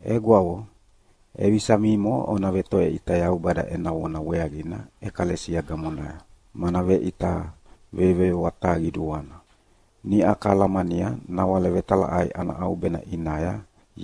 Egwavo, ʼevisa mimo ona vetoveʼita Yaubada ena vona weaqina ʼekalesia gamonaya, mana veʼita veyoveyoa taha qiduana. Niʼa kalamania nawale vetalaʼai ana ʼaubena ʼinaya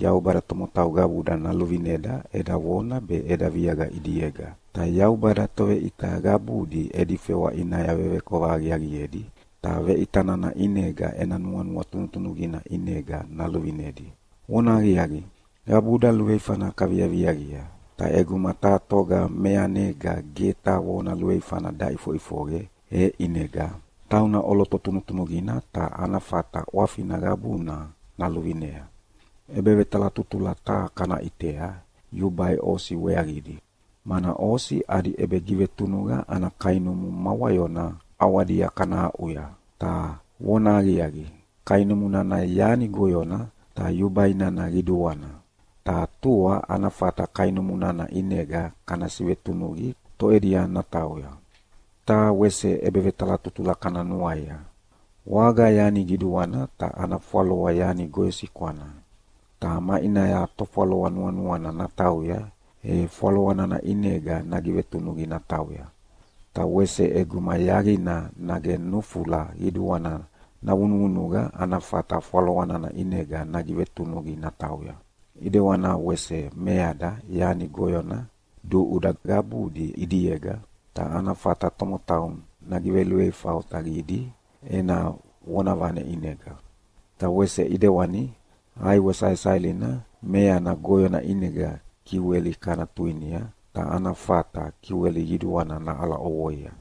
Yaubada tomotau qabuda naluvineda eda vona be eda viaqa ʼidiega. Ta Yaubada toveʼita qabudi edi fewa ʼinaya vevekova aqiaqiedi, ta veʼita nana ʼinega ena nuanua tunutunuqina ʼinega naluvinedi. Vonahaqiaqi, qabuda luveifana kaviaviaqia, ta ʼeguma taha toga meanega ge taha vona luveifana daʼifoʼifoqe, e ʼinega tauna ʼoloto tunutunuqina ta ana fata ʼwafina qabuna naluvinea. ʼEbevetalatutula taha kana ʼitea yubai osi weaqidi, mana osi adi ʼebegivetunuqa ana kainumu ma wayona ʼawadia kana aʼuya. Ta vonahaqiaqi, kainumu nana yani goyona, ta yubai nana qiduana, ta tua ana fata kainumu nana ʼinega kana sivetunuqi toʼedia natauya. Taha wese ʼebevetalatutula kana nuaia: Waga yani qiduana ta ana fwaloa yani goyosikwana. Ta maʼinaya tofwaloa nuanuana natauya, e fwaloa nana ʼinega nagivetunuqi natauya. Ta wese ʼeguma yaqina nage nufula qiduana navunuvunuqa ana fata fwaloa nana ʼinega nagivetunuqi natauya. ʼIdewana wese meada yani goyona duʼuda qabudi ʼidiega, ta ana fata tomotau nagiveluveifa otaqidi ena vonavane ʼinega. Ta wese ʼidewani ʼaiwe saesaelina meana goyona ʼinega kiweli kana tuinia, ta ana fata kiweli qiduana naʼala ʼovoia.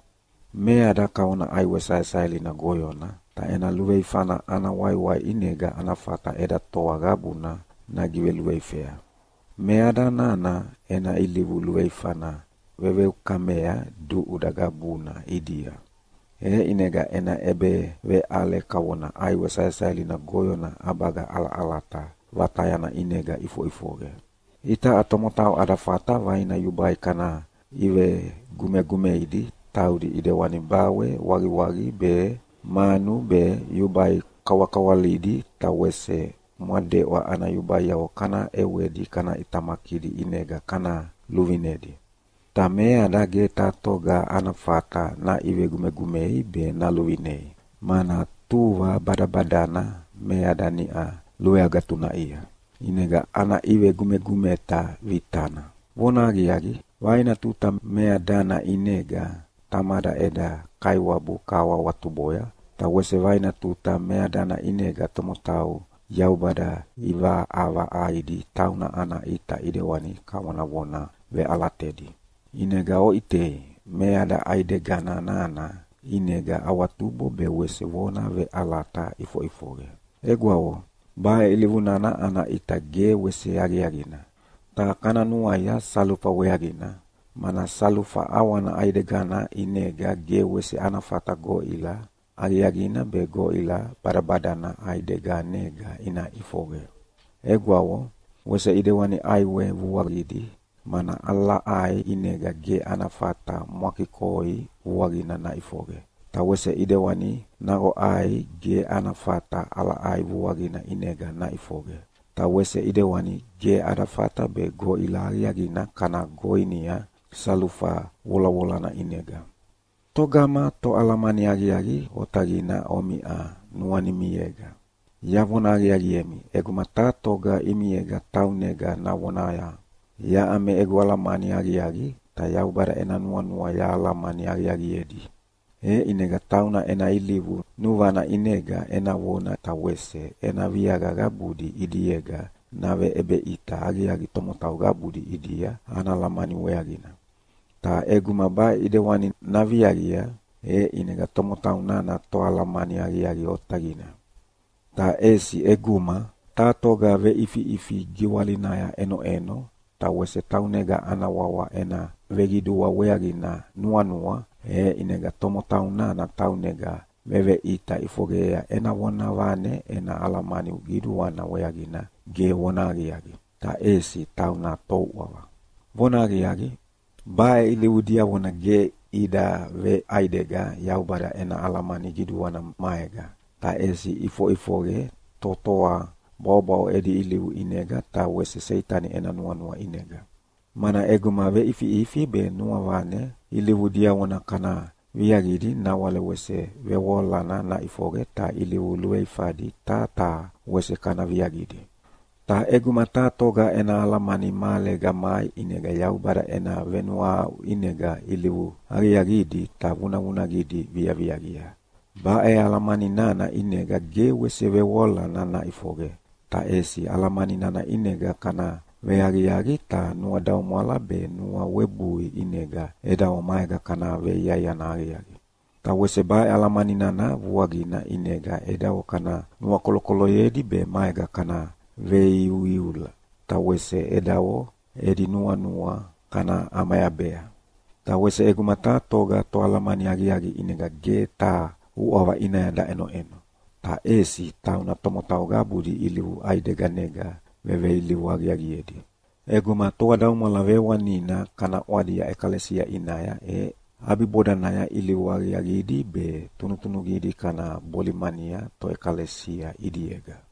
Meada kavona ʼaiwe saesaelina goyona, ta ena luveifana ana waiwai ʼinega ana fata eda toa qabuna nagiveluveifea. Meada nana ena ilivu luveifana veveukamea duʼuda qabuna ʼidia. E ʼinega ena ʼebeveʼale kavona ʼaiwe saesaelina goyona ʼabaga ʼalaʼalata vatayana ʼinega ʼifoʼifoqe. Itaʼa tomotau ada fata vaina yubai kana ʼivegumegumeidi taudi ʼidewana bawe waqiwaqi be, manu be, yubai kawakawalidi, ta wese mwadeʼwa ana yubaiavo kana ʼewedi kana ʼitamakidi ʼinega kana luvinedi. Ta meada ge taha toga ana fata naʼivegumegumei be naluvinei, mana tuva badabadana meada niʼa luveagatunaʼia, ʼinega ana ʼivegumegumeta vitana. Vonahaqiaqi, vaina tuta meadana ʼinega Tamada eda Kaiwabu kahawahawatuboya, ta wese vaina tuta meadana ʼinega tomotau Yaubada ʼivaʼavaʼaidi tauna ana ʼita ʼidewani kavonavona veʼalatedi. ʼInega oʼitei, meada ʼaidega nana ʼinega awatubo be wese vona veʼalata iʼifoʼifoqe. Egwavo, baʼe ilivu nana ana ʼita ge wese aqiaqina. Ta kana nuaia salufa weaqina, mana salufa ʼawana ʼaidegana ʼinega ge wese ana fata goʼila aqiaqina be goʼila badabadana ʼaideganega ina ʼifoqe. Egwavo, wese ʼidewani ʼaiwe vuaqidi, mana ʼalaʼai ʼinega ge ana fata mwakikoi vuaqina naʼifoqe, ta wese ʼidewani naqoʼai ge ana fata ʼalaʼai vuaqina ʼinega naʼifoqe. Ta wese ʼidewani ge ada fata be goʼila aqiaqina kana goinia salufa volavolana ʼinega. Togama toalamani aqiaqi otaqina omiʼa nuanimiega? Yavona aqiaqiemi, ʼeguma taha toga ʼimiega taunega navonaya, “Yaʼa me egu alamani aqiaqi ta Yaubada ena nuanua yahalamani aqiaqiedi.” E ʼinega tauna ena ilivu nuvana ʼinega ena vona ta wese ena viaqa qabudi ʼidiega naveʼebeʼita aqiaqi tomotau qabudi ʼidia ena alamani weaqina. Ta ʼeguma baʼe ʼedewani naviaqia, e ʼinega tomotau nana toalamani aqiaqi otaqina! Ta ʼesi ʼeguma taha toga veʼifiʼifi giwalinaya ʼenoʼeno ta wese taunega ana wawa ena veqidua weaqina nuanua, e ʼinega tomotau nana taunega veveʼita ʼifoqeyea ena vonavane ena alamani qiduana weaqina ge vonahaqiaqi, ta ʼesi tauna touʼava. Vonahaqiaqi, baʼe ilivu diavona ge ida veʼaidega Yaubada ena alamani qiduana maega, ta ʼesi iʼifoʼifoqe totoa bwaʼobwaʼo edi ilivu ʼinega ta wese Seitani ena nuanua ʼinega. Mana ʼeguma veʼifiʼifi be nuavane ilivu diavona kana viaqidi nawale wese vevoalana naʼifoqe ta ilivu luveifadi taha taha wese kana viaqidi. Ta ʼeguma taha toga ena alamani mahalega mai ʼinega Yaubada ena venuahaʼu ʼinega ilivu aqiaqidi ta vunavunaqidi viaviaqia. Baʼe alamani nana ʼinega ge wese vevoalana naʼifoqe, ta ʼesi alamani nana ʼinega kana veaqiaqi ta nuadaumwala be nuawebui ʼinega edavo maega kana veiaiana aqiaqi. Ta wese baʼe alamani nana vuaqina ʼinega edavo kana nuakolokoloyedi be maega kana veiuiula, ta wese edavo edi nuanua kana ʼamayabea. Ta wese ʼeguma taha toga toalamani aqiaqi ʼinega ge taha uʼava ʼinaya daʼenoʼeno, ta ʼesi tauna tomotau qabudi ilivu ʼaideganega veveilivu aqiaqiedi. ʼEguma toadaumwala vewanina kana ʼwadia ʼekalesia ʼinaya e ʼabibodanaya ilivu aqiaqidi be tunutunuqidi kana bolimania toʼekalesia ʼidiega.